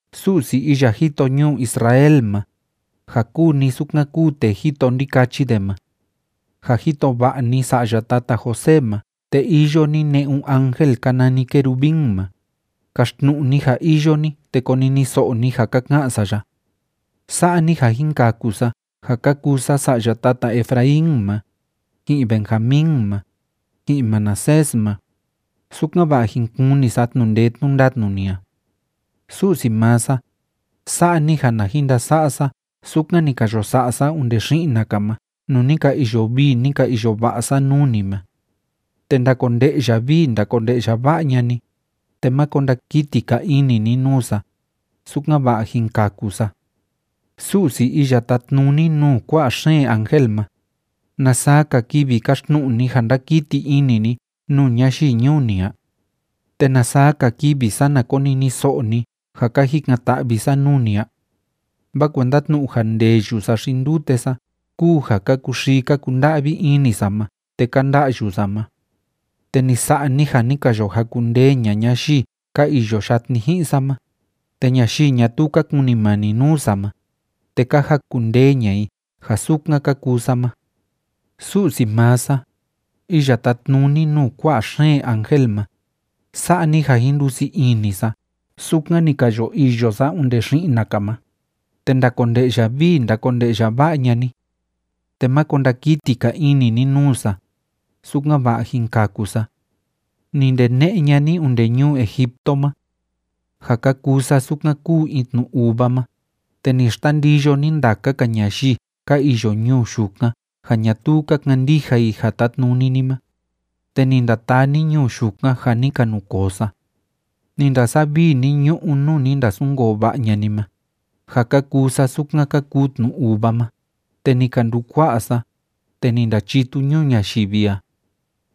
Su'si iya jito ñuu Israel ma, ja kúu ni sukan kúu tee jito ndikachi de ma, ja jito va'a ni sa'ya tata José ma te iyo ni ne'un ángel ka nani querubín ma, kaxtnu'u ni ja iyo ni te koniniso'o ni ja ka ka'an sa ya. Sa'a ni ja jin kaku sa ja ka kuu sa sa'ya tata Efraín ma, ji'in Benjamín ma, ji'in Manasés ma, sukan‑va'a jin kuni sa tnu'u ndee tnu'u ndatnu ni a. Su'si maa sa, sa'a ni ja na jin ndasa'a sa sukan ni ka yo sa'a sa onde xi'na‑ka ma nuu ni ka iyo vii, ni ka iyo va'a sa nuu ni ma. Te ndakonde'ya vii ndakonde'ya va'a ña'a ni, te máko ndakiti‑ka ini ni nuu sa, sukan‑va'a jin kaku sa. Su'si iya tátnuni nuu kua'a xeen ángel ma, ¿na saa‑ka kivi káxtnu'u ni ja ndákiti ini ni nuu ñayii ñuu ni a? ¿Te na saa‑ka kivi sana koniniso'o ni ja ka jikan‑ta'vi sa nuu ni a? Vaa kuenda tnu'u ja ndeyu sa xi ndute sa kúu ja ka kuxii ka kunda'vi ini sa ma te ka nda'yu sa ma. Te ni sa'a ni ja ni ka yo jakundee ña'a ñayii ka iyo yatni ji'in sa ma, te ñayii ñatuu ka kunimani nuu sa ma, te ka jakundee ña'a i ja sukan ka kuu sa ma. Su'si maa sa, iya tátnuni nuu kua'a xeen ángel ma, sa'a ni ja jin ndusii ini sa sukan ni ka yo iyo sa onde xi'na‑ka ma, te ndakonde'ya vii ndakonde'ya va'a ña'a ni, te máko ndakiti‑ka ini ni nuu sa, sukan‑va'a jin kaku sa. Ni ndene'e ña'a ni onde ñuu Egipto ma, ja ka kuu sa sukan kúu in tnu uva ma, te ni xtandiyo ni ndaka‑ka ñayii ka iyo ñuu yukan ja ñatuu ka kandija i ja tátnuni ni ma, te ni ndataa ni ñuu yukan ja ni ka nukoo sa. Ni ndasavii ni ñu'ú nuu ni ndasunkoo va'a ña'a ni ma, ja ka kuu sa sukan ka kuu tnu uva ma, te ni ka ndukua'a sa, te ni ndachitu ñuu ñayivi a.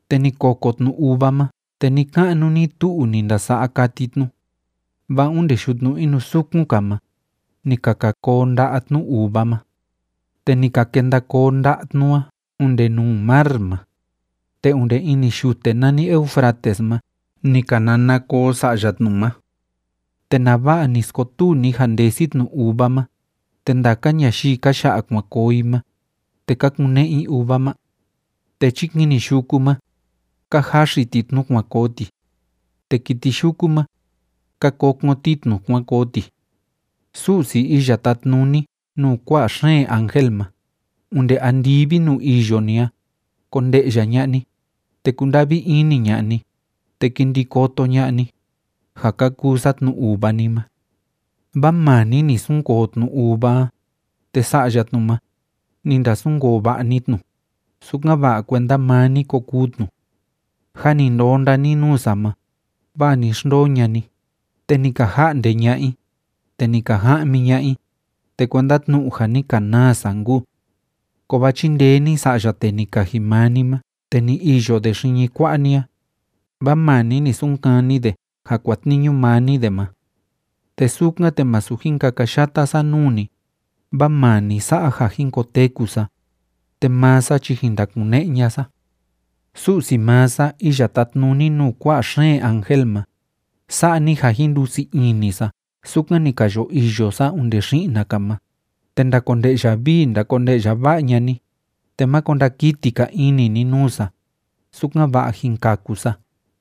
Te ni koko tnu uva ma te ni‑ka'nu ni‑tu'u ni ndasa'a kati tnu, vaa onde yutnu inusukun‑ka ma, ni ka ka koo nda'a tnu uva ma, te ni ka kenda koo nda'a tnu a onde nuu mar ma, te onde ini yute nani Eufrates ma ni ka nana koo sa'ya tnu ma. ¿Te nava'a ni skotuu ni ja ndesi tnu uva ma, te ndaka ñayii ka ya'a kuan koo i ma, te ka kune'e i uva ma? Te chikini yuku ma, ka jaxi ti tnu kuan koo ti, te kiti yuku ma, ka kokon ti tnu kuan koo ti. Su'si iya tátnuni nuu kua'a xeen ángel ma, onde andivi nuu iyo ni a konde'ya ña'a ni, te kunda'vi ini ña'a ni, te ki ndi koto ña'a ni, ja ka kuu sa tnu uva ni ma. Vaa maa ni ni sunkoo tnu uva a, te sa'ya tnu ma, ni ndasunkoo va'a ni tnu, sukan‑va'a kuenda maa ni ko kuu tnu. Jâ ni ndonda ni nuu sa ma, vaa ni xndoo ña'a ni, te ni ka ja'nde ña'a i, te ni ka ja'mi ña'a i, te kuenda tnu'u ja ni ka naa sa nkuu. Kovaa chindee ni sa'ya tee ni kaji maa ni ma te ni iyo de xiñi kua'a ni a, vaa maa ni ni sunkani de ja kuatniñu maa ni de ma. Te sukan, te masu jin kakayata sa nuu ni, vaa maa ni sa'a ja jin koteku sa, te maa sa chi jin ndakune'e ña'a sa. Su'si maa sa, iya tátnuni nuu kua'a xeen ángel ma, sa'a ni ja jin ndusii ini sa sukan ni ka yo iyo sa onde xi'na‑ka ma, te ndakonde'ya vii ndakonde'ya va'a ña'a ni, te máko ndakiti‑ka ini ni nuu sa, sukan‑va'a jin kaku sa.